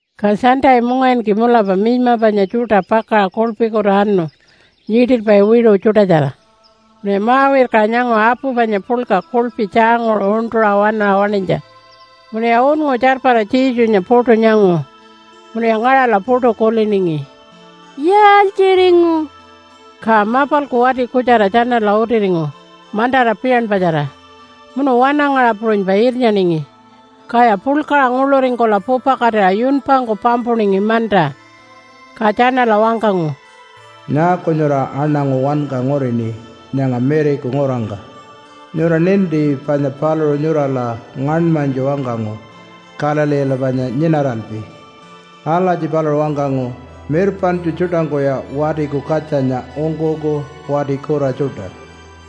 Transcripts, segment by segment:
Ka Sunday mungawinki mulapa minyma panya tjuṯa pakaṟa kuḻpikutu anu nyiṯilpai wiṟu tjuṯatjara. Munuya ma-wirkaṟa nyangu apu panya puḻka kuḻpi tjaanguṟu uṉṯuṟa-waṉaṟa waṉinytja. Munuya unngu tjarpara Jesunya puṯu nyangu. Munuya ngaṟala puṯu kuliningi, “Yaaltjiringu?” Ka mapalku wati kutjara tjanala utiringu mantara piṟanpatjara munu wanangaṟa puṟunypa irnyaningi. Kaya puḻkaṟa nguḻuringkula pupakatira yunpangku pampuningi manta. Ka tjanala wangkangu, “Nyaaku nyura aṉangu wanka ngurini nyanga miriku ngurangka? Nyura ninti panya paluṟu nyurala ngaṉmanytju wangkangu Galileela panya nyinaralpi. Alatji paluṟu wangkangu, ‘Mirpaṉtju tjuṯangkuya Watiku Katjanya ungkuku wati kura tjuṯa,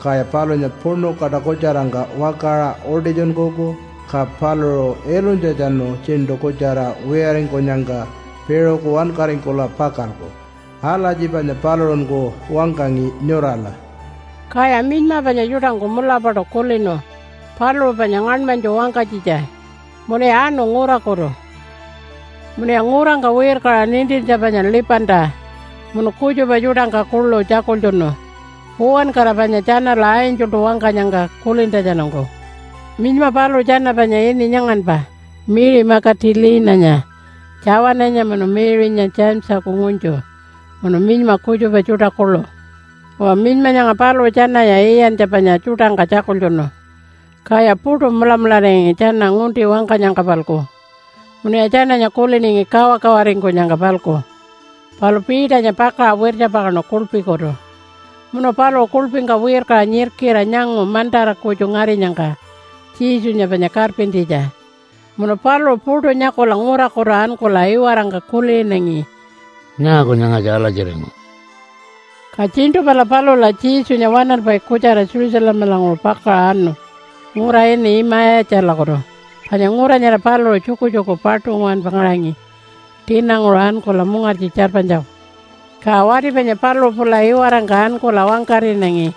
kaya palunya puṉu kaṯakutjarangka wakaṟa utitjunkuku. Ka paluṟu ilunytjatjanu tjiṉṯu kutjara wiyaringkunyangka piṟuku wankaringkula pakalku.’ Alatji panya paluṟunku wangkangi nyurala.” Kaya minyma panya tjuṯangku mulapaṯu kulinu paluṟu panya ngaṉmanytju wangkanytjitja munuya anu ngurakutu. Munuya ngurangka wirkaṟa nintintja panya 11-ta munu kutjupa tjuṯangka kuḻu tjakultjunu uwankara panya tjanala angeltu wangkanyangka kulintjatjanungku. Minyma paluṟu tjana panya ini nyanganpa, Mary Magdalene-anya, Tjawananya, munu Mary-nya Jamesaku ngunytju munu minyma kutjupa tjuṯa kuḻu. Uwa, minyma nyanga paluṟu tjanaya iyantja panya tjuṯangka tjakultjunu, kaya puṯu mulamularingangi tjana ngunti wangkanyangka-palku. Munuya tjananya kuliningi kawakawaringkunyangka-palku. Palu Peternya pakaṟa wirtjapakaṉu kuḻpikutu, munu paluṟu kuḻpingka wirkaṟa nyirkiṟa nyangu mantara kutju ngarinyangka Jesunya panya karpintjitja. Munu paluṟu puṯu nyakula ngurakutu ankula iwarangka kuliṟinangi, “Nyaaku nyangatja alatjiringu?” Ka tjiṉṯu pala palula Jesunya waṉalpai kutjara Jerusalemalanguṟu pakaṟa anu ngura ini Imayatjalakutu, panya ngura nyara paluṟu tjukutjuku paṯu nguwanpa ngaṟangi, tinanguṟu ankula mungartji tjarpanytjaku. Ka wati panya paluṟu pula iwarangka ankula wangkaṟinangi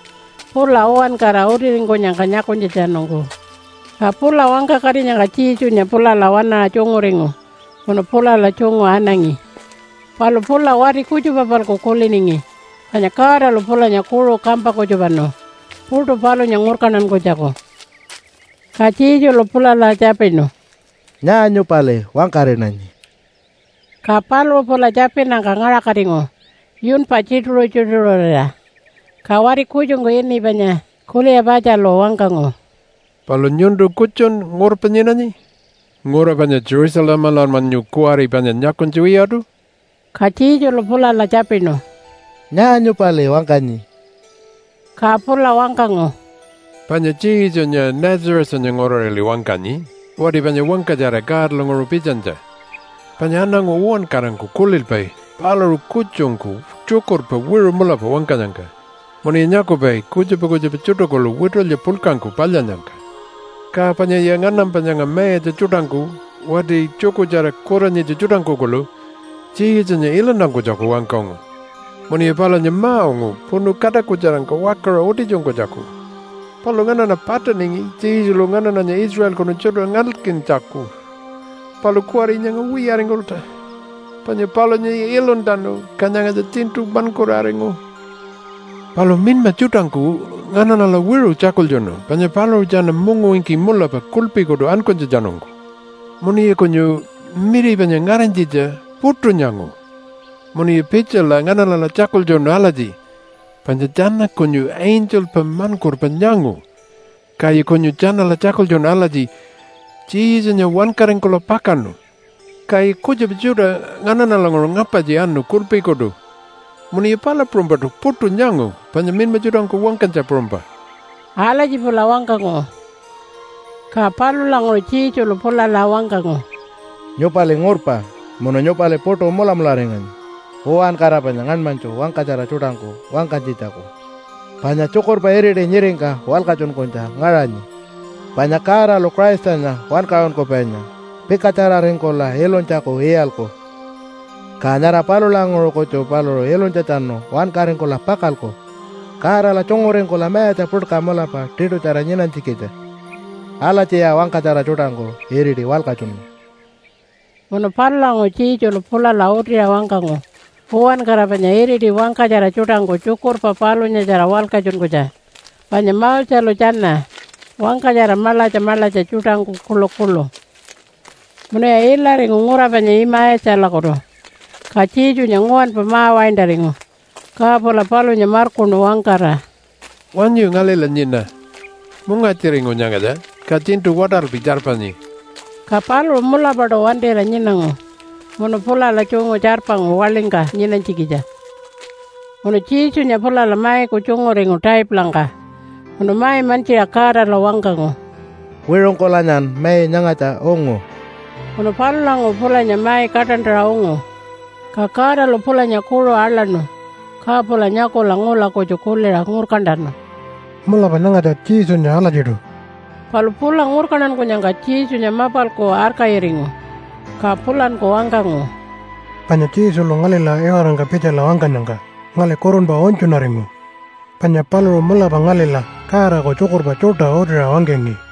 pula uwankara utiringkunyangka nyakunytjatjanungku. Ka pula wangkakatinyangka Jesunya pulala waṉaṟa tjunguringu munu pulala tjungu anangi. Palu pula wati kutjupa-palku kuliningi, panya Godalu pulanya kuṟu kampa kutjupanu puṯu palunya ngurkantankunytjaku. Ka Jesulu pulala tjapinu, “Nyaa nyupali wangkaṟinanyi?” Ka paluṟu pula tjapinnyangka ngaṟakatingu yunpa tjituṟu-tjituṟurira. Ka wati kutjungku ini panya Kuliya-patjalu wangkangu, “Palu nyuntu kutjun ngurpa nyinanyi? Ngura panya Jerusalemalan wanyu kuwari panya nyakunytja wiyaṯu?” Ka Jesulu pulala tjapinu, “Nyaa nyupali wangkanyi?” Ka pula wangkangu, “Panya Jesunya Nazarethanya nguraṟali wangkanyi wati panya wangkatjara Godalanguṟu pitjanytja. Panya aṉangu uwankarangku kulilpai paluṟu kutjungku tjukurpa wiṟu mulapa wangkanyangka munuya nyakupai kutjupa kutjupa tjuṯa kuḻu witulya puḻkangku palyannyangka. Ka panyaya nganampa nyanga mayatja tjuṯangku wati tjukurtjara kuranyitja tjuṯangku kuḻu Jesunya iluntankunytjaku wangkangu munuya palunya ma-ungu puṉu kaṯakutjarangka wakaṟa utitjunkunytjaku. Palu nganaṉa paṯaningi Jesulu nganaṉanya Israelkunu tjuṯa ngalkintjaku. Palu kuwari nyanga wiyaringulta, panya palunyaya iluntanu, ka nyangatja tjiṉṯu maṉkuraringu. “Palu minyma tjuṯangku nganaṉala wiṟu tjakultjunu panya paluṟu tjana mungawinki mulapa kuḻpikutu ankunytjatjanungku. Munuya kunyu miri panya ngarinytjitja puṯu nyangu munuya pitjala nganaṉala tjakultjunu alatji panya tjana kunyu angelpa maṉkurpa nyangu, kaya kunyu tjanala tjakultjunu alatji, ‘Jesunya wankaringkula pakaṉu.’ Kaya kutjupa tjuṯa nganaṉalanguṟu ngapartji anu kuḻpikutu munuya palu puṟunypaṯu puṯu nyangu panya minyma tjuṯangku wangkanytja puṟunypa.” Alatji pula wangkangu. Ka palulanguṟu Jesulu pulala wangkangu, “Nyupali ngurpa munu nyupali puṯu mulamularinganyi uwankara panya ngaṉmanytju wangkatjara tjuṯangku wangkanytjitjaku. Panya tjukurpa iriti nyiringka walkatjunkunytja ngaṟanyi, panya Godalu Christanya Wankaṟunkupainya pikatjararingkula ilunytjaku iyalku, ka nyara palulanguṟu kutju paluṟu ilunytjatjanu wankaringkula pakalku Godala tjunguringkula mayatja puḻka mulapa tiṯutjara nyinanytjikitja. Alatjiya wangkatjara tjuṯangku iriti walkatjunu.” Munu palulanguṟu Jesulu pulala utiṟa wangkangu uwankara panya iriti wangkatjara tjuṯangku tjukurpa palunyatjara walkatjunkunytja, panya Moselu tjana wangkatjara maḻatja maḻatja tjuṯangku kuḻukuḻu. Munuya ilaringu ngura panya Imayatjalakutu, ka Jesunya nguwanpa ma-waintaringu. Ka pula palunya markuṉu wangkara, “Wanyu ngalila nyina. Mungartjiringu nyangatja ka tjiṉṯu waṯalpi tjarpanyi.” Ka paluṟu mulapaṯu wantira nyinangu munu pulala tjungu tjarpangu waḻingka nyinanytjikitja. Munu Jesunya pulala maiku tjunguringu taipulangka munu mai mantjiṟa Godala wangkangu, “Wiṟungkulanyan mai nyangatja ungu.” Munu palulanguṟu pulanya mai kaṯantaṟa ungu. Ka Godalu pulanya kuṟu aḻaṉu ka pula nyakula ngula kutju kuliṟa ngurkantanu, “Mulapa nyangatja Jesunya alatjiṯu.” Palu pula ngurkantankunyangka Jesunya mapalku arkayiringu. Ka pulanku wangkangu, “Panya Jesulu ngalila iwarangka pitjala wangkanyangka ngali kurunpa unytjunaringu, panya paluṟu mulapa ngalila Godaku tjukurpa tjuṯa utiṟa wangkangi.”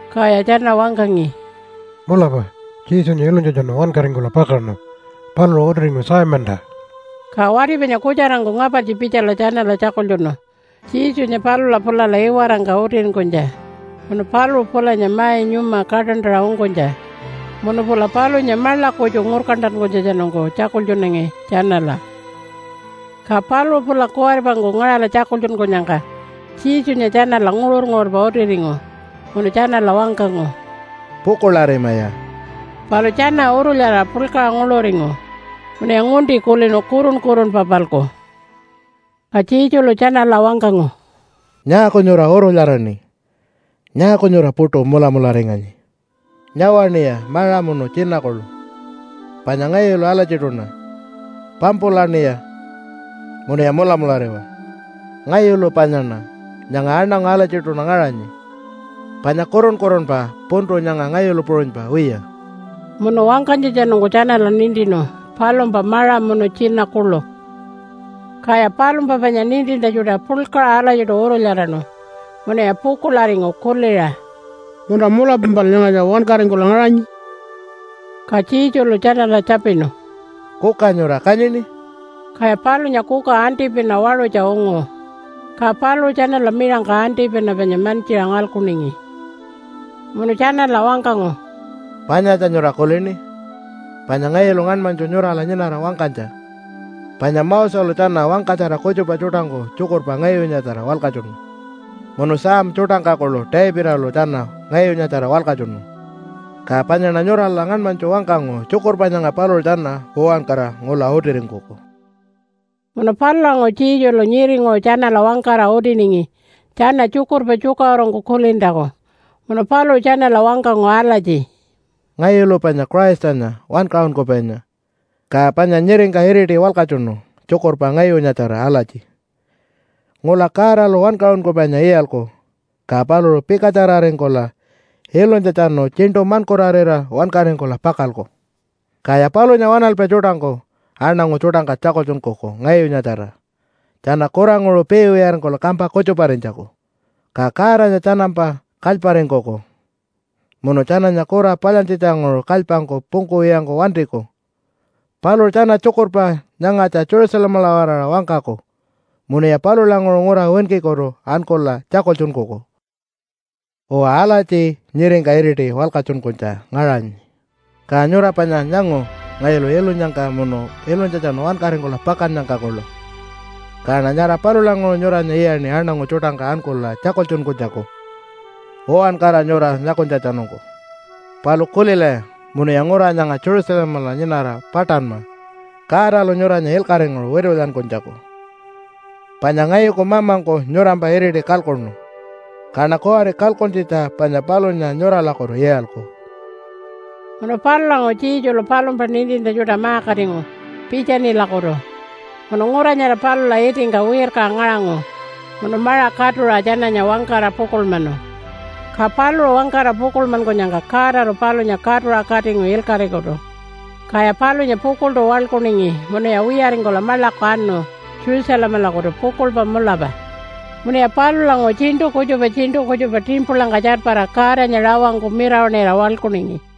Kaya tjana wangkangi, “Mulapa Jesunya ilunytjatjanu wankaringkula pakaṉu. Paluṟu utiringu Simonta.” Ka wati panya kutjarangku ngapartji pitjala tjanala tjakultjunu Jesunya palula pulala iwarangka utiringkunytja munu paluṟu pulanya mai nyuma kaṯantaṟa ungkunytja. Munu pula palunya maḻa kutju ngurkantankunytjatjanungku tjakultjunangi tjanala. Ka paluṟu pula kuwaripangku ngaṟala tjakultjunkunyangka Jesunya tjanala nguṟur-nguṟurpa utiringu munu tjanala wangkangu, “Pukuḻarimaya!” Palu tjana urulyaraṟa puḻkaṟa nguḻuringu munuya ngunti kulinu kurun-kurunpa-palku. Ka Jesulu tjanala wangkangu, “Nyaaku nyura urulyaraṉi? Nyaaku nyura puṯu mulamularinganyi? Nyawaṉiya maṟa munu tjina kuḻu, panya ngayulu alatjiṯuṉa. Pampulaṉiya munuya mulamulariwa. Ngayulu panyaṉa. Nyanga aṉangu alatjiṯuṉa ngaṟanyi, panya kurun-kurunpa puntu nyanga ngayulu puṟunypa wiya.” Munu wangkanytjatjanungku tjanala nintinu palumpa maṟa munu tjina kuḻu. Kaya palumpa panya nintintja tjuṯa puḻkaṟa alatjiṯu urulyaraṉu munuya pukuḻaringu kuliṟa, “Munta mulapampal nyangatja wankaringkula ngaṟanyi?” Ka Jesulu tjanala tjapinu, “Kuka nyura kanyini?” Kaya palunya kuka antipina waṟutja ungu. Ka paluṟu tjanala miṟangka antipina panya mantjiṟa ngalkuningi. Munu tjanala wangkangu, “Panyatja nyura kulini, panya ngayulu ngaṉmanytju nyurala nyinara wangkanytja? Panya Moselu tjana wangkatjara kutjupa tjuṯangku tjukurpa ngayunyatjara walkatjunu, munu Psalm tjuṯangka kuḻu Davidalu tjana ngayunyatjara walkatjunu. Ka panyaṉa nyurala ngaṉmanytju wangkangu tjukurpa nyanga paluṟu tjana uwankara ngula utiringkuku.” Munu palulanguṟu Jesulu nyiringuṟu tjanala wangkara utiningi tjana tjukurpa tjukaṟurungku kulintjaku. Munu paluṟu tjanala wangkangu alatji, “Ngayulu panya Christanya Wankaṟunkupainya, ka panya nyiringka iriti walkatjunu tjukurpa ngayunyatjara alatji, ‘Ngula Godalu Wankaṟunkupainya iyalku ka paluṟu pikatjararingkula ilunytjatjanu tjiṉṯu maṉkurarira wankaringkula pakalku. Kaya palunya waṉalpai tjuṯangku aṉangu tjuṯangka tjakultjunkuku ngayunyatjara tjana kuranguṟu piiwiyaringkula kampa kutjuparinytjaku, ka Godanya tjanampa kalyparingkuku munu tjananya kura palyantjitjanguṟu kalypangku pungkuwiyangku wantiku. Paluṟu tjana tjukurpa nyangatja Jerusalemala-waraṟa wangkaku munuya palulanguṟu ngura winkikutu ankula tjakultjunkuku.’ “Uwa alatji nyiringka iriti walkatjunkunytja ngaṟanyi. Ka nyura panya nyangu ngayulu ilunyangka munu ilunytjatjanu wankaringkula pakannyangka kuḻu. Kaṉa nyara palulanguṟu nyuranya iyaṉi aṉangu tjuṯangka ankula tjakultjunkunytjaku uwankara nyura nyakunytjatjanungku. Palu kulilaya munuya ngura nyanga Jerusalemala nyinara paṯanma Godalu nyuranya ilkaṟinguṟu witulyankunytjaku. Panya ngayuku Mamangku nyurampa iriti kalkuṉu, kaṉa kuwari kalkuntjitja panya palunya nyuralakutu iyalku.” Munu palulanguṟu Jesulu palumpa nintintja tjuṯa ma-katingu Piitjanilakutu, munu ngura nyara palula itingka wirkaṟa ngaṟangu, munu maṟa katuṟa tjananya wangkara pukuḻmanu. Ka paluṟu wangkara pukuḻmankunyangka Godalu palunya katuṟa katingu ilkaṟikutu. Kaya palunya pukuḻṯu waḻkuningi munuya wiyaringkula maḻaku anu Jerusalemalakutu pukuḻpa mulapa. Munuya palulanguṟu tjiṉṯu kutjupa tjiṉṯu kutjupa timpulangka tjarpara Godanya rawangku mirawaṉira waḻkuningi.